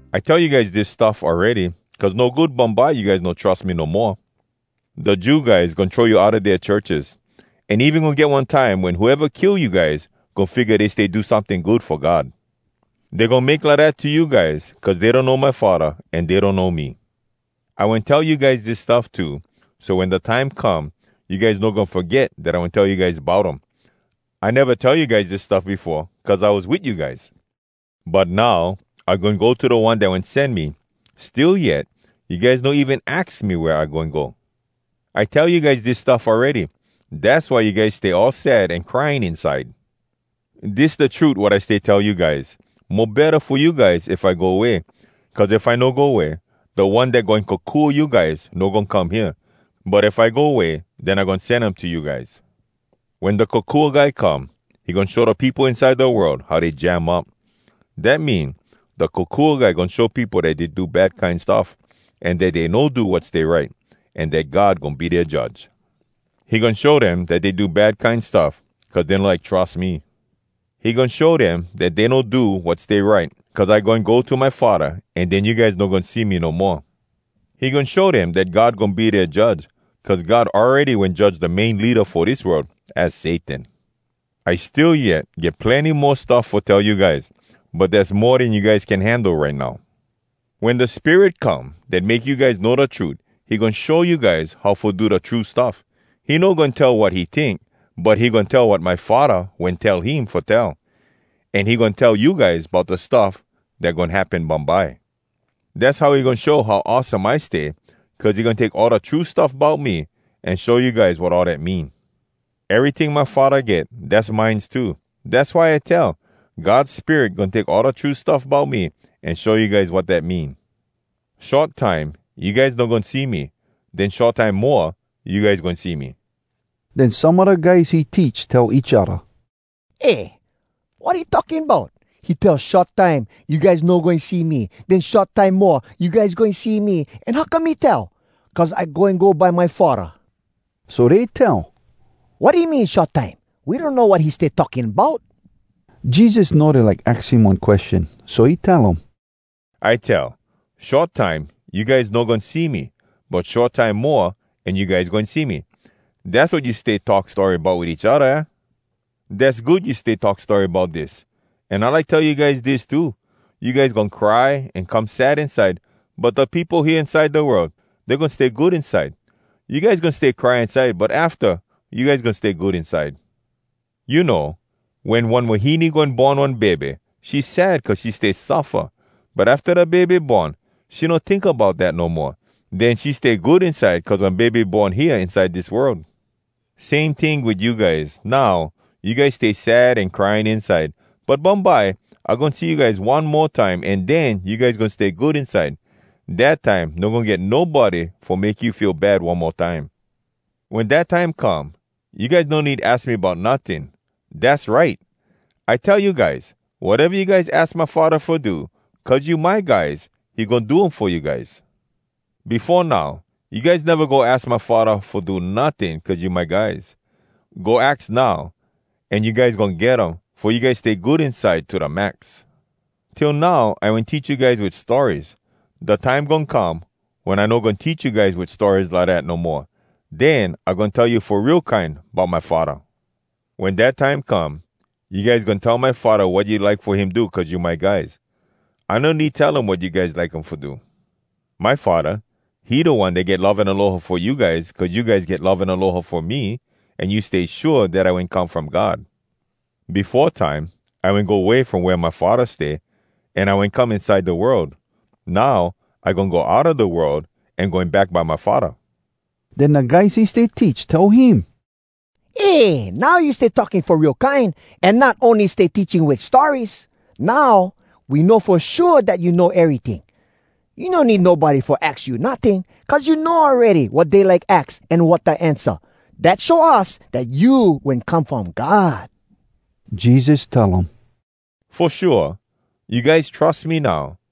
“I tell you guys dis stuff awready, cuz no good bumbye you guys no trus me no moa. Da Jew guys goin throw you outa dea churches. An even goin get one time wen whoeva kill you guys goin figga dey stay do someting good fo God. Dey goin make lidat to you guys cuz dey donno my Faddah an dey donno me. I wen tell you guys dis stuff too, so wen da time come, you guys no goin foget dat I wen tell you guys bout um. I neva tell you guys dis stuff befo, cuz I was wit you guys. “But now I goin go to da One dat wen sen me. Still yet, you guys no even aks me wea I goin go. I tell you guys dis stuff awready. Dass why you guys stay all sad an crying inside. Dis da trut, wat I stay tell you guys: Mo betta fo you guys if I go way. Cuz if I no go way, da One dat goin kokua you guys no goin come hea. But if I go way, den I goin sen him to you guys. “Wen Da Kokua Guy come, he goin show da peopo inside da world how dey jam up. Dat mean, da Kokua Guy goin show peopo dat dey do bad kine stuff, an dat dey no do wat stay right, an dat God goin be dea Judge. He goin show dem dat dey do bad kine stuff, cuz dey no like trus me. He goin show dem dat dey no do wat stay right, cuz I goin go to my Faddah, an den you guys no goin see me no moa. He goin show dem dat God goin be dea Judge, cuz God awready wen judge da main leada fo dis world, az Satan. “I still yet get plenny mo stuff fo tell you guys. But dass mo den you guys can handle right now. Wen da Spirit come dat make you guys know da trut, he goin show you guys how fo do da true stuff. He no goin tell wat he tink, but he goin tell wat my Faddah wen tell him fo tell. An he goin tell you guys bout da stuff dat goin happen bumbye. Dass how he goin show how awesome I stay, cuz he goin take all da true stuff bout me an show you guys wat all dat mean. Eryting my Faddah get, dass mines too. Dass why I tell, God Spirit goin take all da true stuff bout me, an show you guys wat dat mean. “Short time, you guys no goin see me. Den short time moa, you guys goin see me.” Den some a da guys he teach tell each odda, “Eh, wat he talking bout? He tell, ‘Short time, you guys no goin see me. Den short time moa, you guys goin see me.’ An how come he tell, ‘Cuz I goin go by my Faddah’?” So dey tell, “Wat he mean, ‘short time’? We donno wat he stay talking bout.” Jesus know dey like aks him one question, so he tell um, “I tell, ‘Short time you guys no goin see me. But short time moa, an you guys goin see me.’ Dass wat you stay talk story bout wit each odda, aah? Dass good you talk story bout dis! An I like tell you guys dis too: you guys goin cry an come sad inside, but da peopo hea inside da world, dey goin stay good inside. You guys goin stay cry inside, but afta, you guys goin stay good inside. You know, wen one wahine goin born one bebe, she sad cuz she stay suffa. But afta da bebe born, she no tink bout dat no moa. Den she stay good inside cuz one bebe born hea inside dis world. Same ting wit you guys: Now, you guys stay sad an crying inside, but bumbye I goin see you guys one mo time, an den you guys goin stay good inside. Dat time, no goin get nobody fo make you feel bad one mo time. “Wen dat time come, you guys no need aks me bout notting. Dass right! I tell you guys, wateva you guys aks my Faddah fo do cuz you my guys, he goin do um fo you guys. Befo now, you guys neva go aks my Faddah fo do notting cuz you my guys. Go aks now, an you guys goin get um, fo you guys stay good inside to da max. “Till now I wen teach you guys wit stories. Da time goin come wen I no goin teach you guys wit stories lidat no moa. Den I goin tell you fo real kine bout my Faddah. Wen dat time come, you guys goin tell my Faddah wat you like fo him do cuz you my guys. I no need tell him wat you guys like fo him do. My Faddah, he da One dat get love an aloha fo you guys, cuz you guys get love an aloha fo me, an you stay shua dat I wen come from God. Befo time I wen go way from wea my Faddah stay, an I wen come inside da world. Now I goin go outa da world, an goin go back by my Faddah.” Den da guys he stay teach tell him, “Eh! Now you stay talking fo real kine, an not ony stay teaching wit stories! Now, we know fo shua dat you know eryting. You no need nobody fo aks you notting, cuz you know awready wat dey like aks an wat da ansa. Dat show us dat you wen come from God!” Jesus tell um, “Fo shua? You guys trus me now?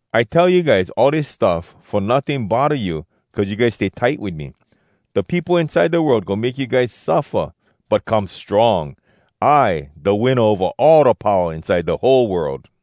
“I tell you guys all dis stuff fo notting bodda you, cuz you guys stay tight wit me. Da peopo inside da world goin make you guys suffa. But come strong! I da winna ova all da powa inside da whole world!”